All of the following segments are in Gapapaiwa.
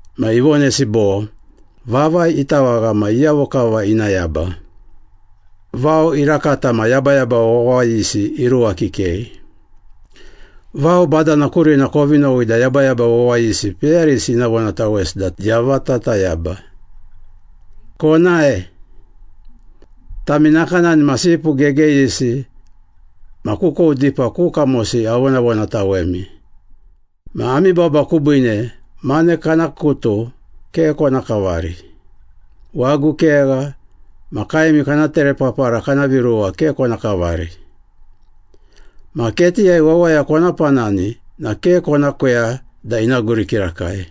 Ma ivonesi bo, “Vavai itawagha ma iyavo kava ina yaba? Vao irakata ma yabayaba wawayisi iruwa kikei. Vao badana kurina kovi nowi da yabayaba wawayisi peyarisi ina vonatawesi da yavata tayaba. Konae. Tami nakanani ma sipu gegeyisi ma kukou dipa ku kamosi avonavonatawemi. Ma ami baba kubiine, mane kana kutu ke kona kavari, wagu kegha, ma kaemi kana terepapara kana viruwa ke kona kavari. Ma ketiyai wawaya kona panani na ke kona kweya da ina guri kirakai.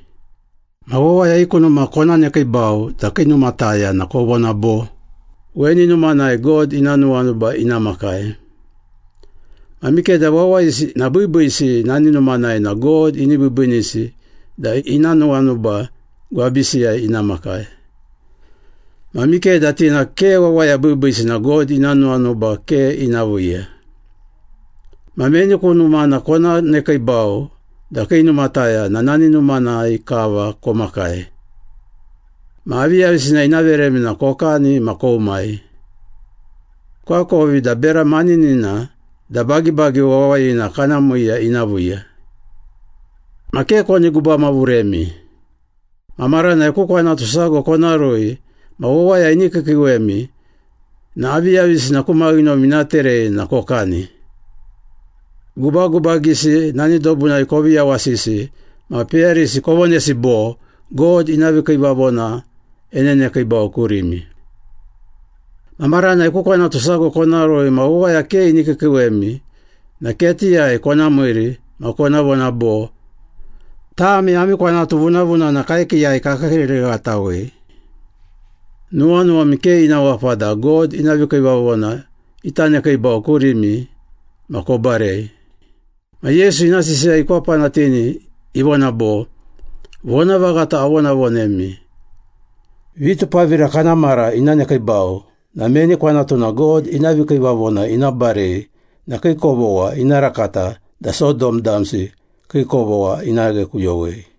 Ma wawaya i ku numa kona nekiibau da kii numataya na kovona bo, ‘Weni numanai God ina nuwanuba ina makai.’ Ma mikeda wawayisi na biibiisi nani numanai na God ini biibiinisi da ina nuwanuba gwabisiyai ina makai. Ma mikeda ti na ke wawaya biibiisi na God ina nuwanuba ke ina viiya. Ma meni ku numana kona nekiibau da kii numataya na nani numanai kava komakai. Ma aviyavisina ina veremi na kokani ma koumai. Koakovi da bera maninina da bagibagi wawayina kana miiya ina viiya. Ma ke koni gubamavuremi. Ma maranai ku kwanatu sago kona rui ma wawaya ini kiikiiwemi na aviyavisina ku maghinomi ina terei na kokani, gubagubagisi nani dobunai kovi yawasisi, ma peyarisi kovonesi bo, ‘God ina vikiivavona enenekiibau kurimi.’ Ma maranai ku kwanatu sago kona rui ma wawaya ke ini kiikiiwemi na ketiyai kona miiri ma kona vona bo, ‘Tami ami kwanatu vunavunana kaekiiyai kakiikiiririghatawei. Nuwanuwami ke ina wapa da God ina vikiivavona ita nekiibau kurimi ma kobarei.’” Ma Yesu ina sisiya ikwapanatini, ivona bo, “Vonavaghata avonavonemi. Vitupavira kana mara ina nekiibau na meni kwanatuna God ina vikiivavona ina barei na kii kovogha ina rakata da Sodom damsi kii kovogha ina ghekuyowei.”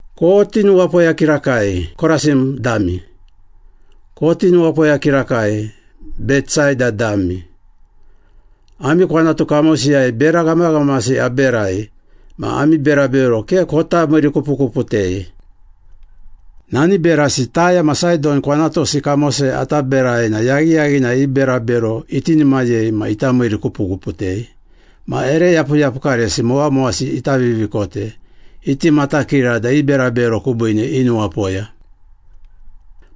“Koti nuwapoya kirakai, Korasin dami! Koti nuwapoya kirakai, Betsaida dami! Ami kwanatu kamosiyai bera ghamaghamasi aberai ma ami berabero ke kota miirikupukuputei. Nani berasi Taya ma Saidon kwanatusi kamosiyai ata berai na yaghiyaghinai i berabero itinimayei ma ita miirikupukuputei ma ere yapuyapukaresi mowamowasi ita vivikote, iti matakira da i berabero kubiine inuwapoya.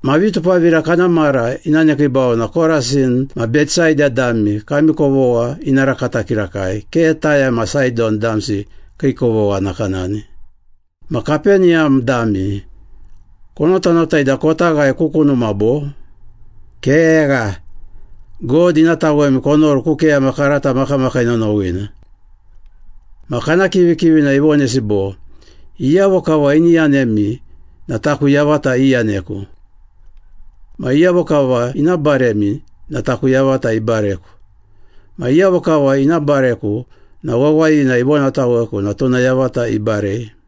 Ma vitupavira kana mara ina nekiibau na Korasin ma Betsaida dami kami kovogha ina rakata kirakai, ke Taya ma Saidon damsi kii kovogha nakanani. Ma Kapeniyam dami, konotanotai da kota ghae ku kunuma, bo? Kegha! God ina tawemi konoru ku keyama karata makamakii nonowina.” Ma kana kivikivina ivonesi bo, “Iyavo kava ini yanemi na taku yavata iyaneku. Ma iyavo kava ina baremi na taku yavata ibareku. Ma iyavo kava ina bareku na wawayina ivonataweku na tuna yavata ibarei.”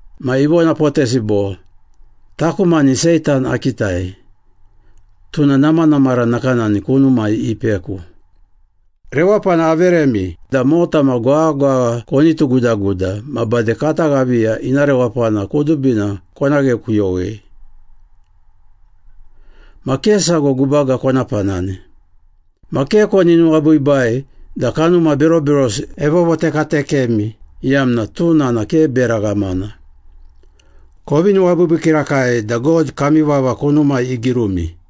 Ma ivonapotesi bo, “Taku mani Seitan akitai, tuna namanamara nakanani kunumai ipeku. Rewapana averemi da mota ma gwaghagwagha koni tugudaguda ma bade kata ghaviya ina rewapana kudubina kona ghekuyowei. Ma ke sago gubaga kona panani. Ma ke koni nuwabiibai da kanuma beroberosi evovotekatekemi, iyamna tuna na ke bera ghamana. Kovi nuwabiibii kirakai da God kami vava kunumai igirumi.”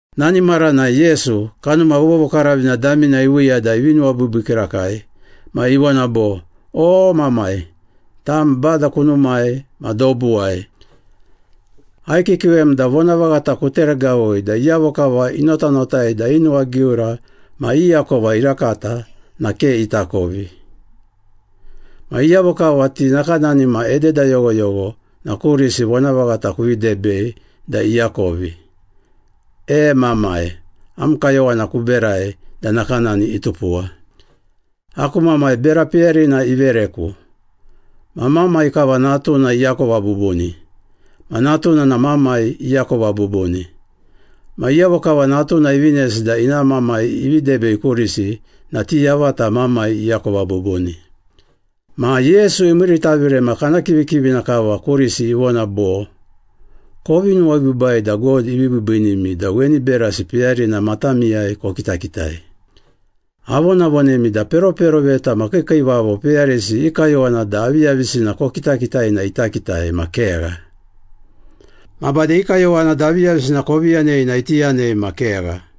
Nani maranai Yesu, Kanuma Vovokaravina damina iviiya da ivi nuwabiibii kirakai ma ivona bo, “O, Mamai, tam Bada kunumai ma dobuwai. Aikiikiiwem da vonavaghata kuteregavui da iyavo kava inotanotai da i nuwagiura ma i akovi irakata na ke itakovi. Ma iyavo kava ti nakanani ma ededa yoghoyogho na kurisi vonavaghata kuvi debei da iakovi. E, Mamai, am kayowana kuberai da nakanani itupuwa.” “Aku Mamai bera peyarina ivereku. Ma Mamai kava Natuna iakova bubuni. Ma Natuna na Mamai iakova bubuni. Ma iyavo kava Natuna ivinesi da ina Mamai ivi debei kurisi na ti yavata Mamai iakova bubuni.” Ma Yesu imiiritavire ma kana kivikivina kava kurisi ivona bo, “Kovi nuwabiibai da God ivi biibiinimi da weni berasi peyarina matamiyai kokitakitai. Avonavonemi da peroperoveta ma kiikiivavo peyarisi i kayowana da aviyavisina kokitakitai na ita kitai ma kegha. Ma bade i kayowana da aviyavisina kovi yanei na iti yanei ma kegha.”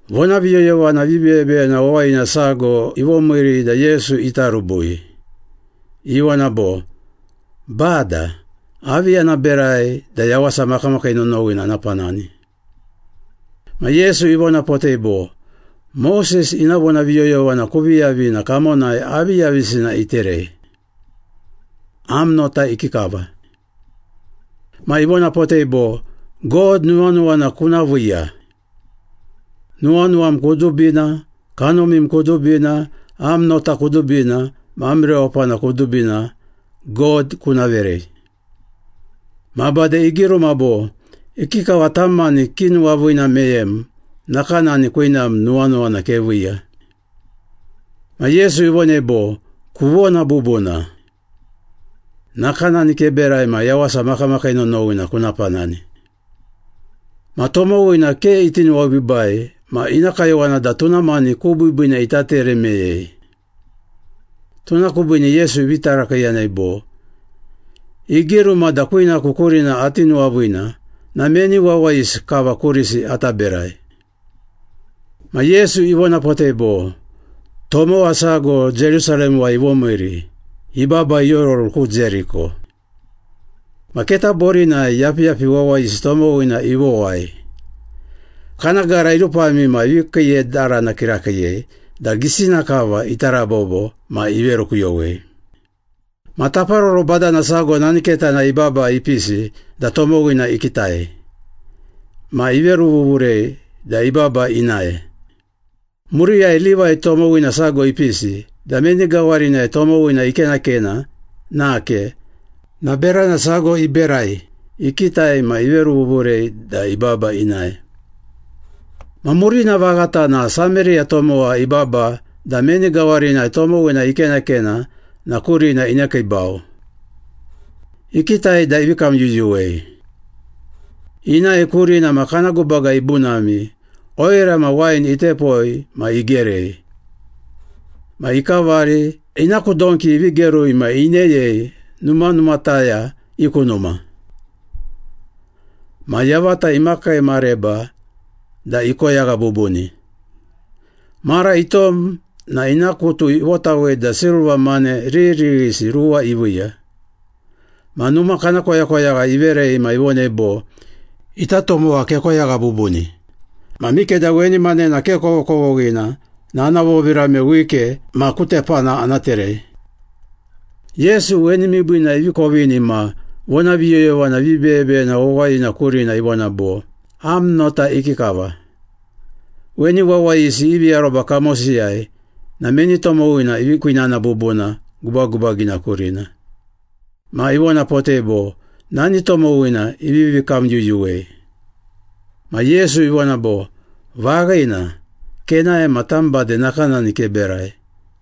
Vonaviyoyovana vibeyebeyena wawayina sago ivomiiri da Yesu ita rubui. Ivona bo, “Bada, avi ana berai da yawasa makamakii nonowina ana panani?” Ma Yesu ivonapotei bo, “Moses ina vonaviyoyovana kuvi yavi na kamonai aviyavisina iterei? Am nota ikikava?” Ma ivonapotei bo, “‘God nuwanuwana kuna viiya. Nuwanuwam kudubina, kanumim kudubina, am nota kudubina ma am rewapana kudubina God kuna verei.’ Ma bade igiruma bo, ‘Ikikava tam mani kinuwaviina meyem, nakanani kwinam nuwanuwana keviiya.’” Ma Yesu ivonei bo, “Kuvona bubuna. Nakanani keberai ma yawasa makamakii nonowina kuna panani.” Ma tomowina ke iti nuwabiibai ma ina kayowana da tuna mani ku biibiina ita tere meyei. Tuna kubiine Yesu ivi tarakiiyanei bo, “Igiruma da kwinaku kurina ati nuwaviina na meni wawayisi kava kurisi ata berai?” Ma Yesu ivonapotei bo, “Tomowa sago Jerusalemuwai ivomiiri, ibaba iororu ku Jeriko. Ma keta borinai yapiyapi wawayisi tomowina ivowai. Kana gara irupami ma ivi kiiyedarana kirakiiyei da gisina kava ita rabobo ma iverukuyowei. Ma taparoro badana sago nani ketanai ibaba ipisi da tomowina ikitai. Ma iveruvuvurei da ibaba inae. Muriyai Livai tomowina sago ipisi da meni gawarinai tomowina ikenakena nake na berana sago iberai, ikitai ma iveruvuvurei da ibaba inae. Ma murina vaghata na Sameriya tomowa ibaba da meni gawarinai tomowina ikenakena na kurina inekiibau. Ikitai da ivi kamyuyuwei. Inae kurina ma kana gubaga ibunami, oira ma wain itepoi ma igerei. Ma ikavari, ina ku donki ivi gerui ma ineyei numanumataya i ku numa. Ma yavata imakii mareba da ikoyagha bubuni. Mara itom na ina kutu ivotawei da silva mane riririghisi ruwa iviiya. Ma numa kana koyakoyagha iverei ma ivonei bo, ‘Ita tomowa kekoyagha bubuni. Ma mikeda weni manena ke kovokovoghina na ana vovirame wike ma ku tepana ana terei.’” Yesu weni miibiina ivi kovini ma vonaviyoyovana vibeyebeyena wawayina kurina ivona bo, “Am nota ikikava? Weni wawayisi ivi aroba kamosiyai na meni tomowina ivi kwinana bubuna gubagubagina kurina?” Ma ivonapotei bo, “Nani tomowina ivivi kamyuyuwei.” Ma Yesu ivona bo, “Vaghina. Kenae ma tam bade nakanani keberai.”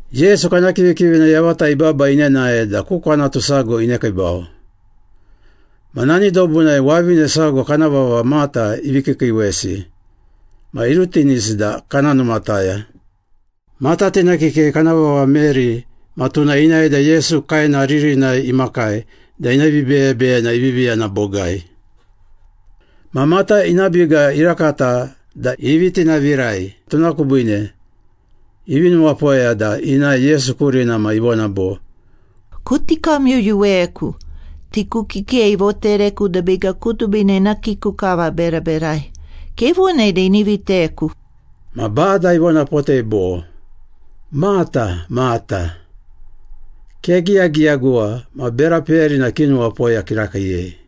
Yesu kana kivikivina yavata ibaba inenae da ku kwanatu sago inekiibau. Ma nani dobunai wavine sago kana vava Mata ivi kiikiiwesi ma irutinisi da kana numataya. Mata tina kikei kana vava Meri ma tuna inae da Yesu kaena ririnai imakai da ina vibeyebeyena ivivi yana bogai. Ma Mata ina biga irakata da ivi tinavirai tuna kubiine ivi nuwapoya da inae Yesu kurina ma ivona bo, “Kuti kamyuyuweku. Tiku kikei ivotereku da biga kudubina ina kiku kava aberaberai. Kevonei da ini viteku.” Ma Bada ivonapotei bo, “Mata, Mata. Kegiyagiyaguwa ma bera peyarina kinuwapoya kirakiiyei.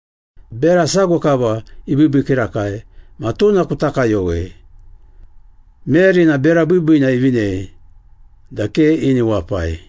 Bera sago kava ibiibii kirakai ma tuna kuta kayowei. Meri na bera biibiina ivinei da ke ini wapai.”